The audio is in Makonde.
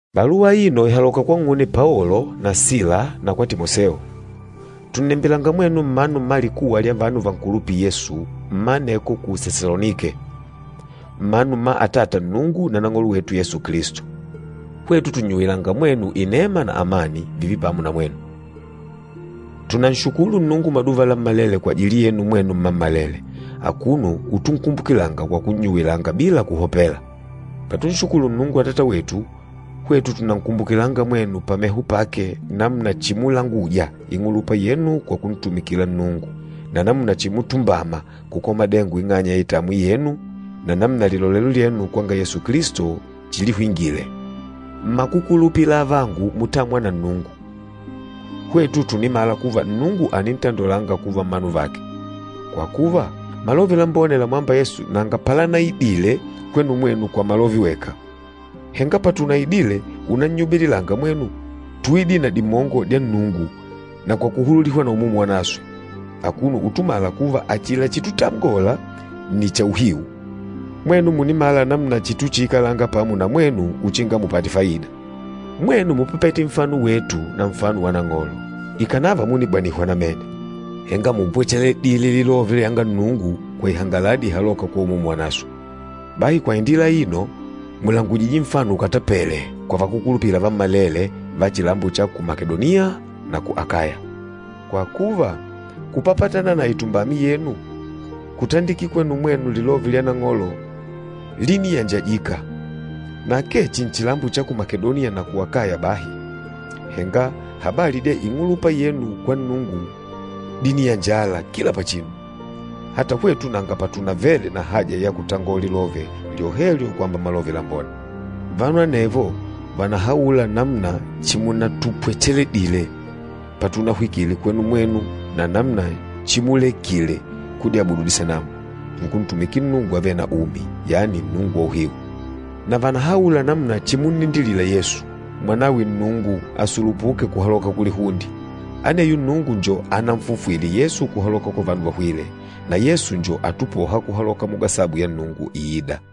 Baluwa aino ìhaloka kwang'une Paolo na Sila na kwa Timoseo. Tùnnembilanga mwenu mmanu mma likuwa lya vanu vankulupîla Yesu mma aneko ku Sesalonike, mmanu mma Atata Nnungu na Nang'olo wetu Yesu Kilisto. Hwetu tùnnyuwilanga mwenu inema na amani, vììve pamo na mwenu. Tùnanshukulu Nnungu maduva lammalele kwajili yenu mwenu mmammalele, akuno utunkumbukilanga kwa kunnyuwilanga bila kuhopela. Patunshukulu Nnungu Atata wetu, hwetu tùnankumbukilanga mwenu pameho pake namuna chimulanguja ing'ulupa yenu kwa kuntumikila Nnungu, na namuna chimutumbama kukola madengo ing'anya ya itamwi yenu na namuna lilolelo lyenu kwanga Yesu Kilisto chilihwingile. Mmakukulupila avangu mutâmwa na Nnungu, hwetu tùnimala kuva Nnungu ànintandolanga kuva mmanu vake. Kwa kuva, Malove Lambone lamwâmba Yesu nanga palanaidile kwenu mwenu kwa malove weka. Henga patunaidile unannyubililanga mwenu, túidile na dimongo dya Nnungu na kwa kuhululihwa na Umumu Wanaswe, akuno utumala kuva achila chitutangola nni cha uhiu. Mwenu mùnimala namuna chituchiikalanga pamo na mwenu uchinga mupate faida. Mwenu múpapete nfano wetu na nfano wa Nang'olo. Ikànava múnibanihwa namene, henga múpwecheledile lilove lyanga Nnungu kwa ihangaladi ihalôka kwa Umumu Wanaswe. Bahi kwa indila aino, mùlangujije nfano ukatapele kwa vakúkulupila vammalele va chilambo cha ku Makedoniya na ku Akaya. Kwa kuva, kupapatana na itumbami yenu, kutandikila kwenu mwenu lilove lya Nang'olo líniyanjajika, na akee chihi nchilambo cha ku Makedoniya na ku Akaya bahi, henga habali dya ing'ulupa yenu kwa Nnungu díniyanjala kila pachinu, ata hwetu nanga patunavele na haja ya kutangola lilove lyohelyo kwamba Malove Lambone. Vanu anevo vànahaula namuna chimunatupwecheledile patunahwikile kwenu mwenu na namuna chimulekile kudyabudu disanamu, nkuntumikila Nnungu avêle na umi, yani Nnungu wa uhiu. Na vànahaula namuna chimunnindilila Yesu, Mwanawe Nnungu asulupuke kuhaloka kulihunde. Aneyo Nnungu njo ananfufwile Yesu kuhaloka kwa vanu vahwîle, na Yesu njo atupôha kuhaloka mugasabu ya Nnungu iîda.